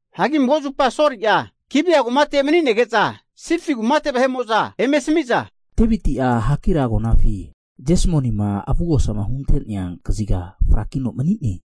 Hagi mago zupa Soli'a Gibea kumate mani'nege'za, Sifi kumate vahe'mo'za eme asami'za, Deviti'a Hakila agonafi Jesmonima avugosama hunte'nea kaziga frakino mani'ne.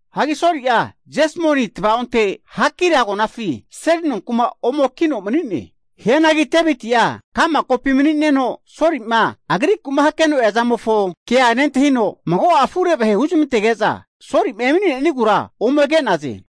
Hagi Soli'a Jesmoni tava'onte Hakila agonafi seli nonku'ma ome kino mani'ne. Hianagi Deviti'a ka'ma kopi mani'neno, Soli'ma agriku'ma hakeno eazamofo kea nentahino, mago'a afure vahe huzamantege'za, Soli'ma emani'nenigura ome ke'naze.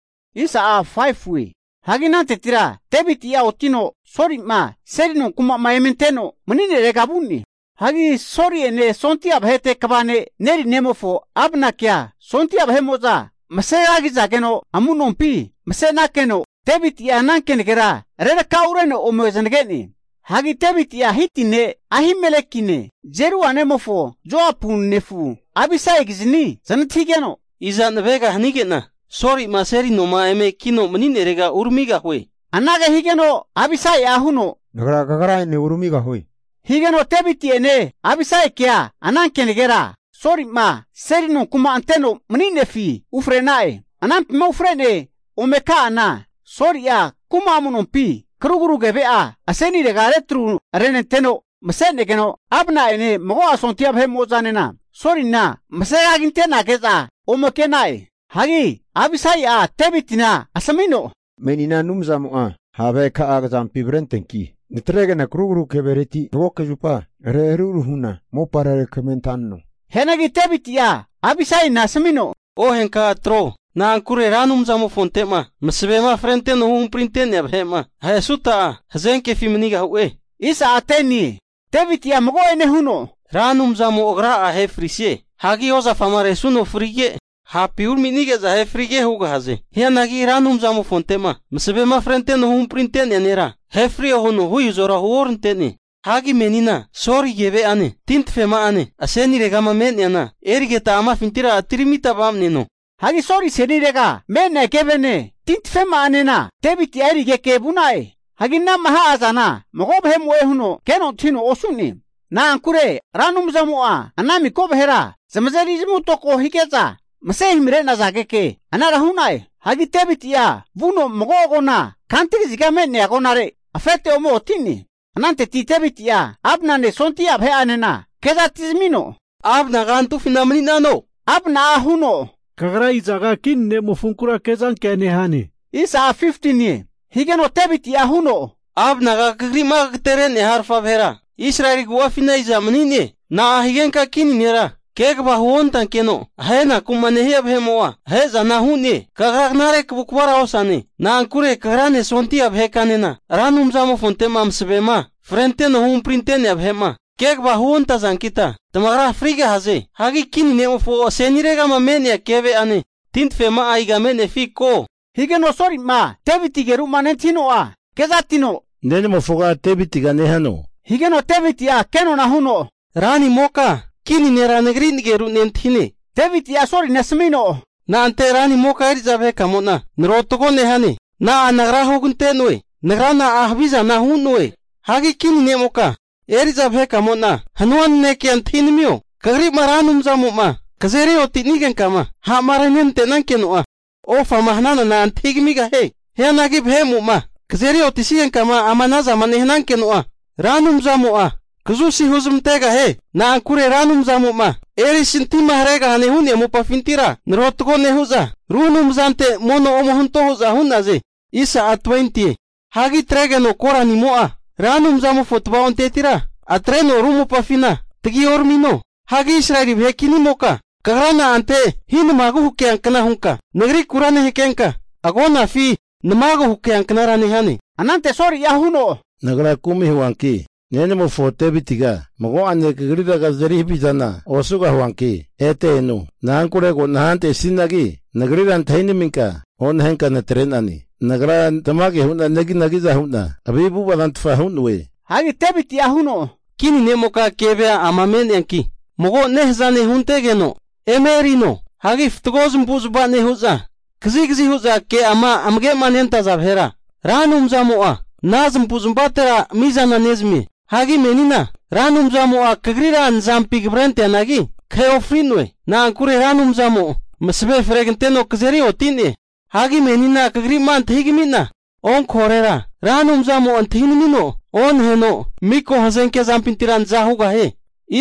Hagi anantetira Deviti'a otino Soli'ma seli nonkuma eme anteno mani'nerega vu'ne. Hagi Soli'ene sondia vahete kva ne'a Neri nemofo Abnakea Sondia vahe'mo'za masegagizageno amu'nompi masenakeno, Deviti'a ana kenagera rerakaureno ome zanage'ne. Hagi Deviti'a Hiti ne' Ahimelekine, Zeruia nemofo Joapu nefu Abisaikizni zanantahigeno, Iza navega hanige'na Soli'ma seli noma eme kino'ma mani'nerega uramigahue. Anage higeno Abisai'a huno, Nagra kagrane uramigahue. Higeno Deviti'ene Abisaikea ana kenagera Soli'ma seli nonku'ma anteno mani'nefi ufre'na'e. Anampima ufrene ome ka'ana, Soli'a kuma amu'nompi karugru keve'a asenirega retru renenteno, masenegeno, Abna'ene mago'a sondia vahe'mo'zanena Solina mase kagi ante'nage'za ome ke'na'e. Hagi Abisai'a Devitina asamino, Menina Anumzamo'a ha' vaheka'a kazampi avrenteanki, natrege'na krugru kevereti magoke zupa reharuharu hu'na mopare rekamarenta'neno. Hianagi Deviti'a Abisaina asamino, Ohenka atro. Na'ankure Ra Anumzamofonte'ma masavema frenteno huhamprinte'nea vahe'ma ahesuta'a, hazenkefi manigahue. Deviti'a mago'ane huno, Ra Anumzamo Agra'a ahe frise. Hagi ozafama resuno frige, hapi uraminige'za ahe frige hugahaze. Hianagi Ra Anumzamofonte'ma masavema frenteno huhamprinte'nea nera ahefrio huno hu izora huonante'ne. Hagi menina Soli keve'ane tintafema'ane aseniregama me'neana erigeta amafintira atiramita va'maneno. Hagi Soli asenirega me'nea kevene, tintafema'anena Deviti'a erigeke vu'na'e. Hagi anama ha'azana mago vahe'mo'e huno keno antahino osu'ne. Na'ankure Ra Anumzamo'a ana miko vahera zamazeri zamavutoko hige'za, mase himre'nazageke anara hu'na'e. Hagi Deviti'a vuno mago agona kantu kaziga me'nea agonare afete ome oti'ne. Ananteti Deviti'a Abnane sondia vahe'anena kezana atizamino, Abnaga antufina mani'nano, higeno Abna'a huno, Kagra izaga kini nemofonkura kezankea nehane. Higeno Deviti'a huno, Abnaga kagri'ma kagatere'nea harafa vahera Israeli agu'afina iza mani'ne? Na'a higenka kini nera kegava huontankeno, ahenaku'ma nehia vahe'mo'a ahe'zana hu'ne? Kagra knare kavukavara osane. Na'ankure kagrane sondia vahekanena Ra Anumzamofonte'ma masavema frenteno huhamprinte'nea vahe'ma kegava huontazankita tamagra frigahaze. Hagi kini ne'mofo aseniregama me'nea keve'ane tintafema'a iga me'nefi keho? Higeno Soli'ma Deviti ageru'ma nentahino'a kezatino, nenamofoga Devitiga nehano. Higeno Deviti'a kenona huno, ranimoka, kini nera nagri nageru nentahine. Deviti'a Solina asamino, Na'ante ranimoka eri'za vahekamo'na narotago nehane? Na'a nagra hugante'noe? Nagra na'a havizana hu'noe? Hagi kininimoka eri'za vahekamo'na hanua nanekea antahinamio, kagrima Ra Anumzamo'ma kazeri oti'nigenkama ha'ma renenante'nankeno'a, ofama hananana antahigamigahie. Hianagi vahe'mo'ma kazeri otisigenkama ama anazama nehanankeno'a, Ra Anumzamo'a kazusi huzmantegahie. Na'ankure Ra Anumzamo'ma erisintima haregahane hu'nea mopafintira naratogo nehu'za, ru anumzante mono ome hunto hu'za hu'naze. Hagi atregeno koranimo'a, Ra Anumzamofo tava'ontetira atreno ru mopafina tagi oramino. Hagi Israeli vahe kinimoka, kagra na'ante hinimagu hakeankna hunka nagrikura nehakenka, agonafi namagu hakeanknara nehane? Anante Soli'a huno, Nagra kumi huanki nenamofo Divitiga mago'ane kagrira kazeri havizana osugahuanki ete eno. Na'ankure ko nahantesinagi, nagrira antahinaminka onahenka natre'nane. Nagra tamage hu'na neginagi'za hu'na havi avu'ava zantfa hu'noe. Hagi Deviti'a huno, kini ne'moka kevea ama me'neanki, mago nehaza ne' huntegeno eme erino. Hagi fatgo zamavu'zmava nehu'za, kazigazi hu'za ke'ama amage'ma nentaza vahera, Ra Anumzamo'a ana zamavu'zamavatera mi'zana nezamie. Hagi menina Ra Anumzamo'a kagrira nazampi kavrenteanagi, kahe ofri'noe. Na'ankure Ra Anumzamo masave freganteno kazeri oti'ne. Hagi menina kagri'ma antahigami'na onkahorera, Ra Anumzamo'a antahinamino onaheno, miko hazenke zampintira naza hugahie.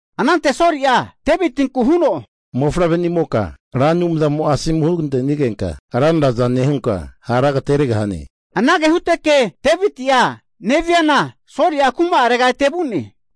Anante Soli'a Devitinku huno, Mofavrenimoka, Ra Anumzamo'a asomu hugante'nigenka ranraza nehunka, hara agateregahane. Anage huteke Deviti'a neviana, Soli'a kuma'arega ete vu'ne.